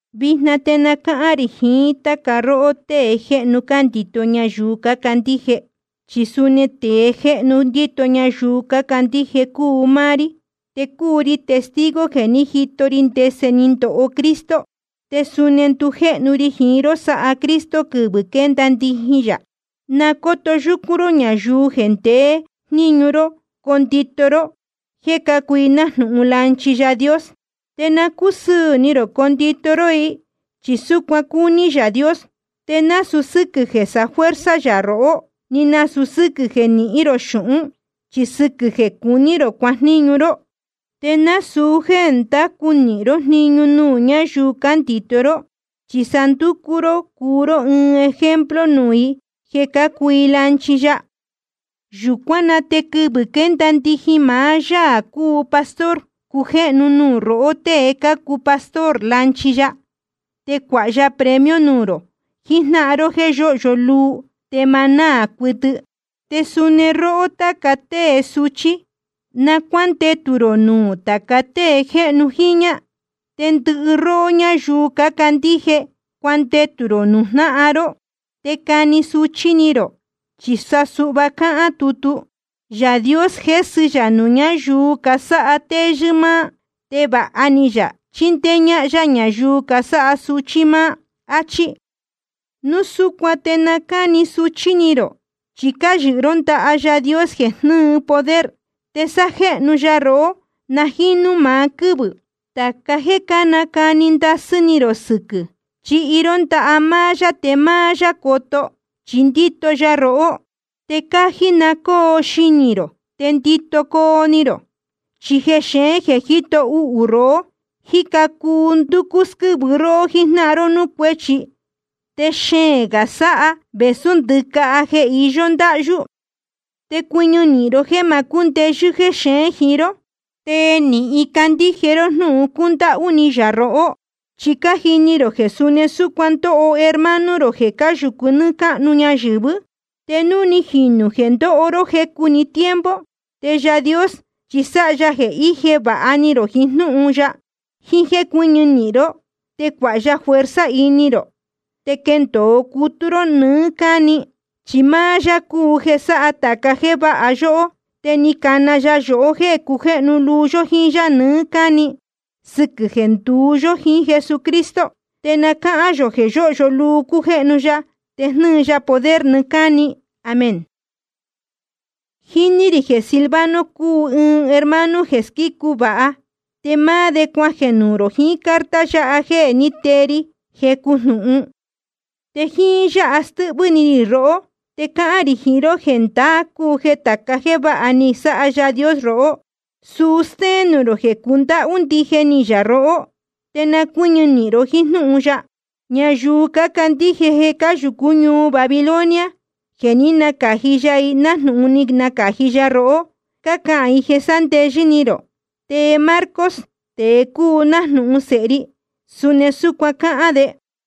Vijna te na cáhán rī jiín táca róhó tée jéhnu cándito ñayuu cácandíje, chi suni tēe jéhnu ndíto ñayuu cácandíje cúu máá rí. Te cúu ri testigo jeē ní jito ri ndese ni ndoho Cristo. Te suni ndujéhnu ri jiín ró sáha Cristo quɨvɨ̄ quénda ndijin yā. Na cóto yúcún ró ñayuu jeē ndeé jníñu ró condito ró, jeē cácuu i nájnūhun lanchi Yaā Dios. Te na cúsɨɨ̄ ni rō condito ró i, chi súcuan cúní Yaā Dios. Te nasūu sɨ́quɨ̄ jeē sáfuerza yā rohó, ni nasūu sɨ́quɨ̄ jeē nihín rō xūhún, chi sa sɨquɨ̄ jeē cuní rō cuajníñu ró. Te nasūu jéē ndacu nīhin ró jniñu nuū ñáyuu cándito ró, chi sa nducú ró cuu ró ɨɨn ejemplo nuū i jeē cácuu i lanchi ya. Yūcuán na te quɨvɨ̄ quénda ndijin maá Yaā cúu Pastor cujéhnu nuū rohó tée cácuu pastor lanchi ya, te cuāha ya premio nuū rō jijnáhan ró jéē yóhyo luu te ma náā cuɨtɨ. Te suni róhó táca tée suchí, na cuándetū rō nuū tāca tée jéhnu jiñā. Te ndɨhɨ róhó ñáyuu cácandíje, cuandetū rō nuū jnáhan ró, te cani suchí ni rō. Chi suhva cáhán tutu: Yaā Dios jésɨ yā nuū ñáyuu casáha téyɨ́ máá, te vāha ni yā chíndéé ñáhán yá ñayuu casáha suchí máá. Achí. Núu súcuan te na cáni suchí ni rō, chi cáyɨhɨ ró ndaha Yaā Dios jeē jnɨ́ɨ poder. Te sájéhnu ya rohó, na jínú maá quɨ́vɨ̄. Tāca jéē cánacani ndasɨ́ ni rō sɨquɨ̄, chihi ró ndaha máá yá te máá yá coto, chi ndíto ya rohó. Te cájí na cóo xinī rō te ndito coo ni rō. Chi jexeén jeē jíto uhū rohó, jíca cuu ndúcú squɨ́vɨ róhó jíjnáhan ró núū cuéchi. Te xeēn gā sáha vēsú ndɨcaha jeē īyo ndáhyú. Te cuɨñɨ nīhin ró jéē ma cúndeyɨ́ jexeén jiín ró, te nīhin candíje ró jnúhun cúndáhú ni yā rohó. Chi cájini rō jeē suni súcuan cándoho hermano rō jeē cáyūcu nɨ́ɨ́ cáhnu ñayɨ̄vɨ́. Te núu ni jīnu jeē ndoho ró jecu‑ni tiempo, te Yaā Dios chi sáha ya jeē ije vāha ni rō jiín jnúhun ya, jiín jéē cuɨ́ñɨ nīhin ró, te cuāha ya fuerza ini rō, te quendōo cutú ró nɨɨ́ cáni. Chi máá yá cúu jeē sáha tāca jéē váha yóhó, te ni cana ya yohó jéē cujéhnu luu yó jíín yá nɨɨ́ cáni, sɨquɨ̄ jeē nduú yó jiín Jesucristo. Te na cáhán yō jeē yóhyo luu cújéhnu ya te jnɨ́ɨ ya poder nɨɨ́ cáni. Amén. Jíní rī jeē Silvano cúu ɨɨn hermano jeē squícu vāha. Te máá de cuajeē nuū rō jiín carta yáha jéē ní tee ri jecu jnūhun. Te jíín yáha stɨ́hvɨ́ ni rī rohó, te cáhán rī jiín ró jeē ndaá cúu jeē tāca jéē váha ni sáha Yaā Dios rohó, suu stéén nuū rō jeē cundáhú ndije ni yā rohó. Te na cuɨ́ñɨ nīhin ró jíín jnúhun yáha. Ñayuu cácandíje jeē cáyūcú ñuu Babilonia, jeē ní nacāji ya i nájnūhun ni nacāji ya rohó, cácahān i jeē sándeyɨ́ ni rō. Te Marcos, tēe cúu nájnūhun sēhe ri, suni súcuan cáhán de.